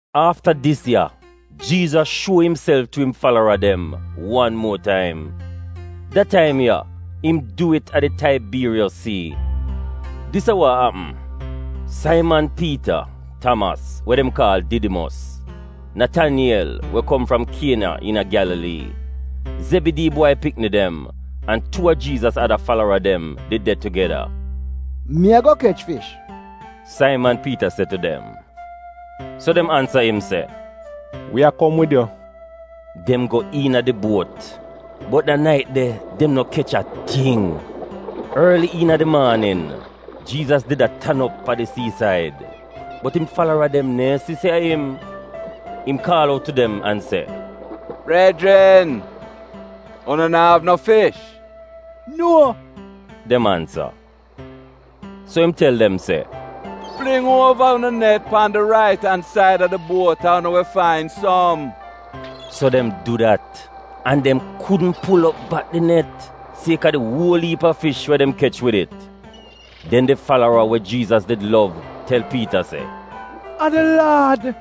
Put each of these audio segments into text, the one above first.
Afta dis ya Jiizas shuo imself tu im falara dem wan muo taim. Da taim ya, im du it a di Taibiiriyos Sii. Dis a wa apm: Saiman Piita, Tamas (we dem kaal Didimos), Nataniyel (we kom fram Kiena iina Gyalalii), Zebidii bwai pikni dem, an tuu a Jiizas ada falara dem did de tugeda. “Mi a go kech fish,” Saiman Piita se tu dem. So dem ansa im se, “Wi a kom wid yu.” Dem go iina di buot, bot da nait de, dem no kech a ting. Orli iina di maanin, Jiizas did a tan op a di sii-said, bot im falara dem neehn si se a im. Im kaal out tu dem an se, “Brejrin, unu na'av no fish?” “Nuo,” dem ansa. So im tel dem se, “Fling uova unu net pan di rait-an-said a di buot an unu wi fain som.” So dem du dat, an dem kudn pul op bak di net, siek-a di uol iip a fish we dem kech wid it. Den di falara we Jiizas did lov tel Piita se, “A di Laad!”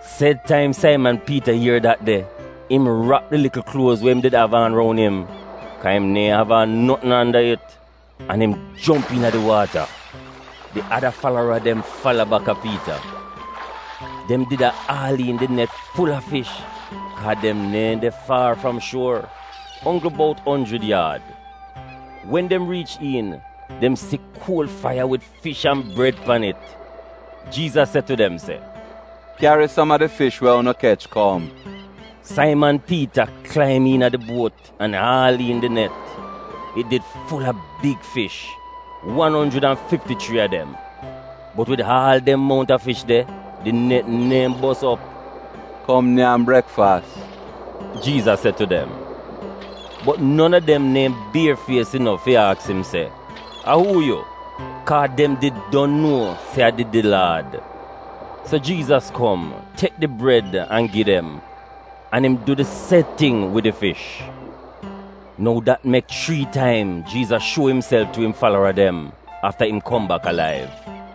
Sed taim Saiman Piita ier dat de, im rap di likl kluoz we im did av aan roun im (kaa im neehn av aan notn anda it) an im jomp iina di waata. Di ada falara dem fala baka Piita. Dem did a aal iin di net ful-a fish kaa dem neehn de faar fram shuor — onggl bout onjrid yaad. Wen dem riich iin, dem si kuol faiya wid fish an bred pan it. Jiizas se tu dem se, “Kyari som a di fish we unu kech kom.” Saiman Piita klaim iina di buot an aal iin di net. It did ful-a big fish, wan onjrid an fifti chrii a dem, bot wid aal dem mount a fish de, di net neehn bos op. “Kom nyam brekfas,” Jiizas se tu dem. Bot non a dem neehn bier fies inof fi aks im se, “A uu yu?” kaa dem did nuo se a did di Laad. So Jiizas kom, tek di bred an gi dem, an im du di sed ting wid di fish. Nou dat mek chrii taim Jiizas shuo imself tu im falara dem afta im kom bak alaiv.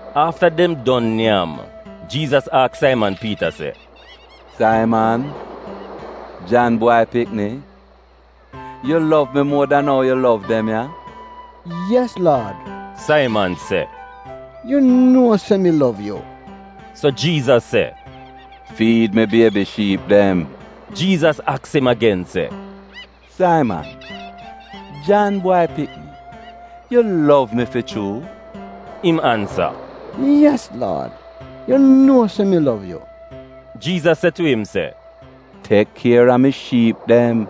Afta dem don nyam, Jiizas aks Saiman Piita se, “Saiman, Jan bwai pikni, yu lov mi muo dan ou yu lov dem ya?” “Yes, Laad,” Saiman se, “Yu nuo se mi lov yu.” So Jiizas se, “Fiid mi biebi shiip dem.” Jiizas aks im agen se, “Saiman, Jan bwai pikni, yu lov mi fi chuu?” Im ansa, “Yes, Laad, yu nuo se mi lov yu.” Jiizas se tu im se, “Tek kier a mi shiip dem.”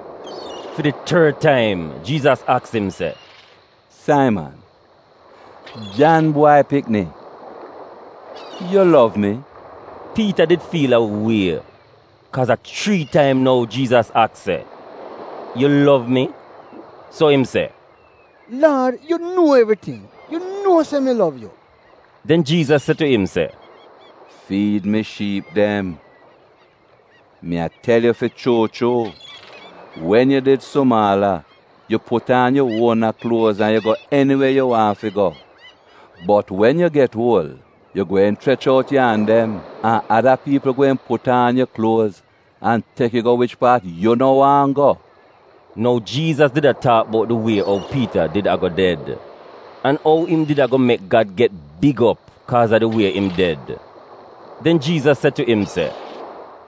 Fi di tord taim Jiizas aks im se, “Saiman, Jan bwai pikni, yu lov mi?” Piita did fiil a wie, kaaz a chrii taim nou Jiizas aks se, “Yu lov mi?” So im se, “Laad, yu nuo evriting. Yu nuo se mi lov yu.” Den Jiizas se tu im se, “Fiid mi shiip dem. Mi a tel yu fi chuu chuu, wen yu did sumaala yu put aan yu uona kluoz an yu go eniwe yu waahn fi go, bot wen yu get uol yu gweehn chrech out yu an dem, an ada piipl gweehn put aan yu kluoz an tek yu go wich paat yu no waahn go.” (Nou Jiizas did a taak bout di wie ou Piita did a-go ded, an ou im did a-go mek Gad get big op kaaz a di wie im ded.) Den Jiizas se tu im se,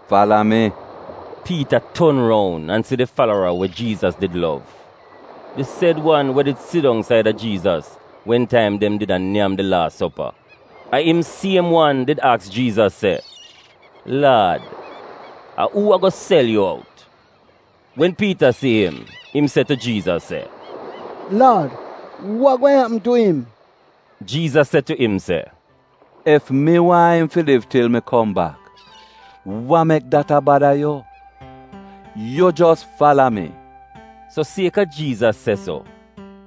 “Fala mi!” Piita ton roun an si di falara we Jiizas did lov. (Di sed wan we did sidong saida Jiizas wen taim dem did a nyam di laas sopa. A im siem wan did aks Jiizas se, “Laad, a uu a-go sel yu out?”) Wen Piita si im, im se tu Jiizas se, “Laad, wa gweehn apm tu im?” Jiizas se tu im se, “Ef mi waahn im fi liv til mi kom bak, wa mek dat a bada yu? Yu jos fala mi.” So siek-a Jiizas se so,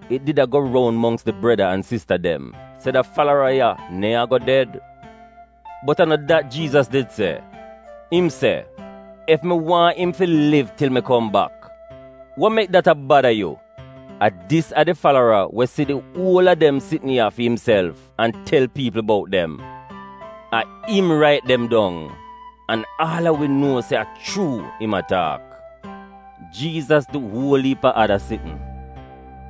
it did a go roun mongks di breda an sista dem se da falara ya neehn a-go ded. Bot a no dat Jiizas did se, im se, “Ef mi waahn im fi liv til mi kom bak, wa mek dat a bada yu?” A dis a di falara we si di uol a dem sitn ya fi imself an tel piipl bout dem. A im rait dem dong an aal a wi nuo se a chuu im a taak. Jiizas du uol iip a ada sitn.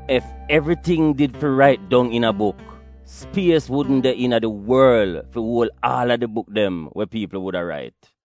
Ef evriting did fi rait dong iina buk, spies wudn de iina di worl fi uol aal a di buk dem we piipl wuda rait.